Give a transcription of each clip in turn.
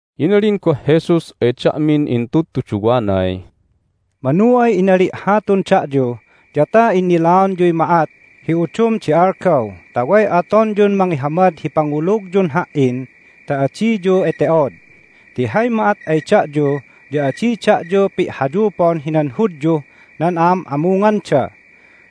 Inalin goh Jesus ay da'min intudtuduwanay, "Manu ay inali' hatun da'yu ya ta innilaonyuy ma'at hi udum di algaw ta way atonyun mangihamad hi pangulugyun Ha"in ta adiyu ete'od. Ti hay ma'at ay da'yu ya adi da'yu pi'hayupon hinan Hudyuh nan a'am'amunganda.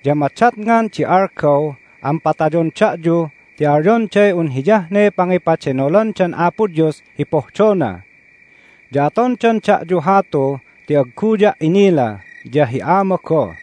Ya madatngan di algaw an patayon da'yu ti alyonday un hiyah ne pangipadenolandan Apo Dios hi pohdona. Ya atondan da'yu hatu ti agguya' inila, ya hi Ama goh.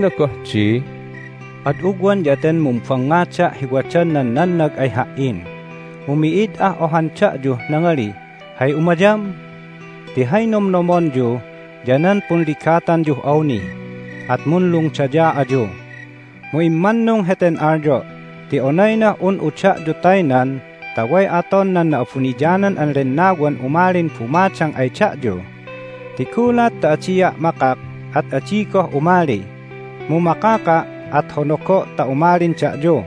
Inalina goh di, "Ad ugwan ya ten mumbangngada' hi wadan nan nannag ay Ha"in, mu mi'id ah ohan da'yuh nangalih, Hay umayam? Ti hay nomnomonyu ya nan punligatanyuh awni, at munlungdaya ayu. Mu immannung heten alyo' ti onaynah un'u da'yu taynan ta way aton nan Na'abuniyanan an Lennawan umalin bumadang ay da'yu, ti gulat ta adia' makak at adi goh umali. Mu makaka', at honogo' ta umalin da'yu.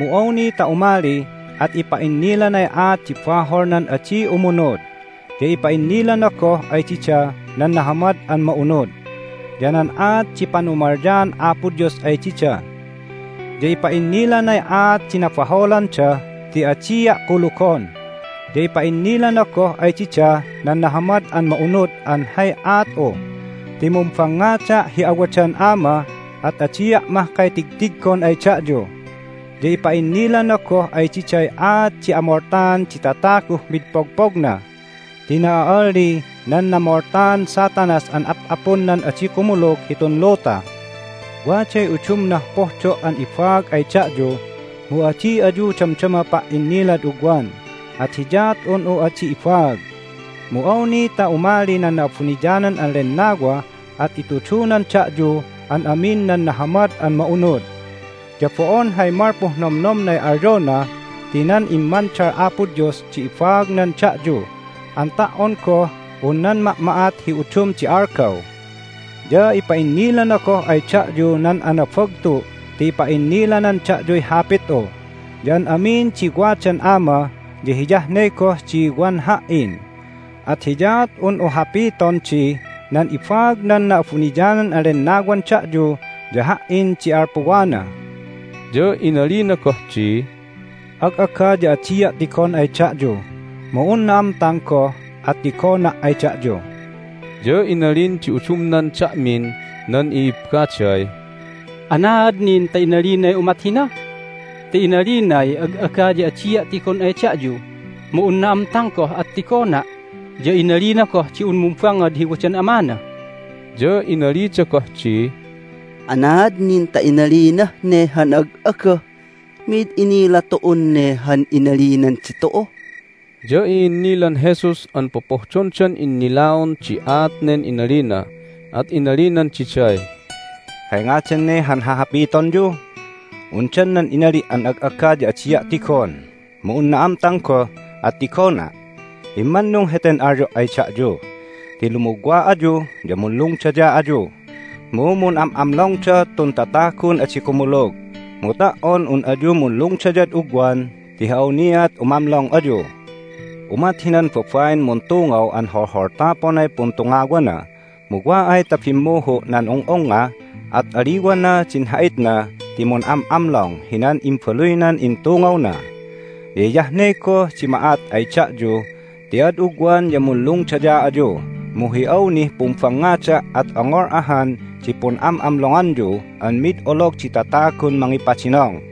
Mu awni ta umali, at ipa'innilanay aat di bahol nan adi umunud, ya ipa'innilana goh ay dida nan Nahamad an Ma'unud, ya nan aat di panumalyaan Apo Dios ay dida. Ya ipa'innilanay aat di nabaholanda ti adia' kulugon, ya ipa'innilana goh ay dida nan Nahamad an Ma'unud an hay aat'u ti mumbangngada' hi awadan Ama, at adia' mahkay tigtiggon ay da'yu. Ya ipa'innilana goh ay diday aat di amoltaan di tataguh mid pogpogna, ti na'a'alli nan namoltaan Satanas an ap'apun nan adi kumulug hitun luta. Waday udumnah pohdo' an ibaag ay da'yu, mu adi ayu damdama pa"inilad ugwan, at hiyaat un'u adi ibaag. Mu awni ta umali nan Na'abuniyanan an Lennawa at itudunan da'yu an amin nan Nahamad an Ma'unud. Ya bo'on hay malpuh nomnomnay alyona, ti nan immandal Apo Dios di ibaagnan da'yu an ta"on goh un nan ma'ma'at hi udum di algaw. Ya ipa'innilana goh ay da'yu nan anabagtu' ti ipa'innilanan da'yuy Hapit'u. Ya an amin di wadan Ama ya hiyah ne goh di wan Ha"in, at hiyaat un'u hapiton di, Nan ibaag nan Na'abuniyanan an Lennawan da'yu ya Ha"in di alpuwana." Nan Punlungdayaanda ya nan Pun'am'amlonganda Ya inalina goh di, "Ag'aga ya adia' tigon ay da'yu, mu un na'amtang goh at tigona' ay da'yu." Ya inalin di udumnan da'min nan i'ibbaday, "Anaad nin ta inalinay umat hina? Ti inalinay, Ag'aga ya adia' tigon ay da'yu, mu un na'amtang goh at tigona', ya inalina goh di un mumbangngad hi wadan Amana." Ya inalida goh di, "Anaad nin ta inalinah ne han ag'aga? Mi'id inila tu'un ne han inalinan ditu'u!" Ya i'innilan Jesus an popohdondan innilaon di aat nen inalina, at inalinan diday, "Hay ngadan ne han hahapitonyu? Undan nan inali' an ag'aga ya adia' tigon, mu un na'amtang goh at tigona'? Immannung heten alyo' ay da'yu ti lumugwa ayu ya munlungdaya ayu, mu mun'am'amlongda tun tatagun adi kumulug. Mu ta"on un ayu munlungdayad ugwan ti hi awniat umamlong ayu. Umat hinan babain muntungaw an holholtaponay puntungawana, mu wa ay ta bimmuhu' nan ung'ungnga at aliwana din ha'itna ti mun'am'amlong hinan imbaluynan intungawna. Ya hiyah ne goh di ma'at ay da'yu ti ad ugwan ya munlungdaya ayu, mu hi awnih pumbangngada' at ongol ahan di pun'am'amlonganyu an mid olog di tatagun mangipadinong.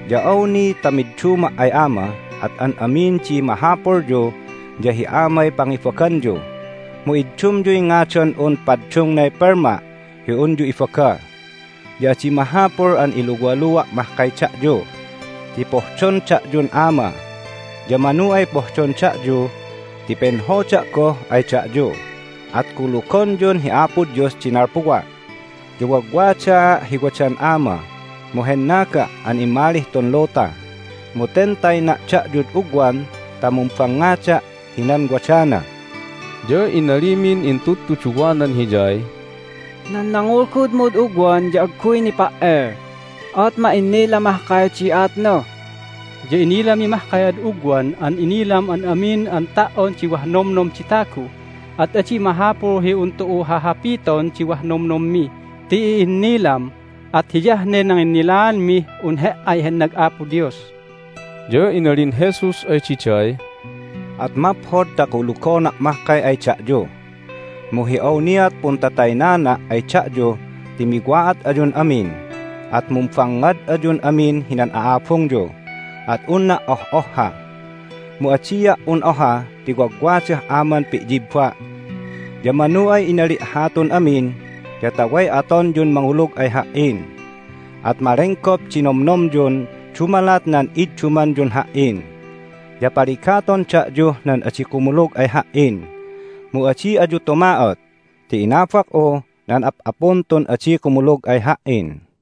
Ya awni ta midduma' ay Ama at an amin di mahapulyu ya hi Amay pangibaganyu, mu iddumyuy ngadan'un paddungnay pelma' hi unyu ibaga. Ya adi mahapul an iluwalua' mahkay da'yu ti pohdon da'yun Ama. Ya manu ay pohdon da'yu ti penhoda' goh ay da'yu, at kulugonyun hi Apo Dios di nalpuwa'. Ya wagwadaa' hi wadan Ama, mu hennaga' an immalih tun luta. Mu ten tayna' da'yud ugwan ta mumbangngada' hinan wadana." Ya inalimin intudtuduwanan Hiyay, "Nan nangulgudmud ugwan ya agguy nipa"el, at ma'innila mahkay di aatna. Ya inilami mahkay ad ugwan an inilam an amin an ta"on di wah nomnom di tagu. At adi mahapul hi un tu'u hahapiton di wah nomnommi ti i'innilam. At hiyah ne nanginnilaanmih un He"ay hennag Apo Dios." Ya inalin Jesus ay diday, "At maphod ta kulugona' mahkay ay da'yu! Mu hi awniat puntataynana' ay da'yu ti miwa'at ayun amin, at mumbangngad ayun amin hinan a'abungyu, at unna' oh'ohha. Mu adia' un oha ti wagwadah Aman pi'yibba'. Ya manu ay inali' hatun amin ya ta way atonyun mangulug ay Ha"in, at malenggop di nomnomyun dumalat nan iddumanyun Ha"in. Ya paligaton da'yuh nan adi kumulug ay Ha"in, mu adi ayu tuma'ot ti inabak'u nan ap'apun tun adi kumulug ay Ha"in!"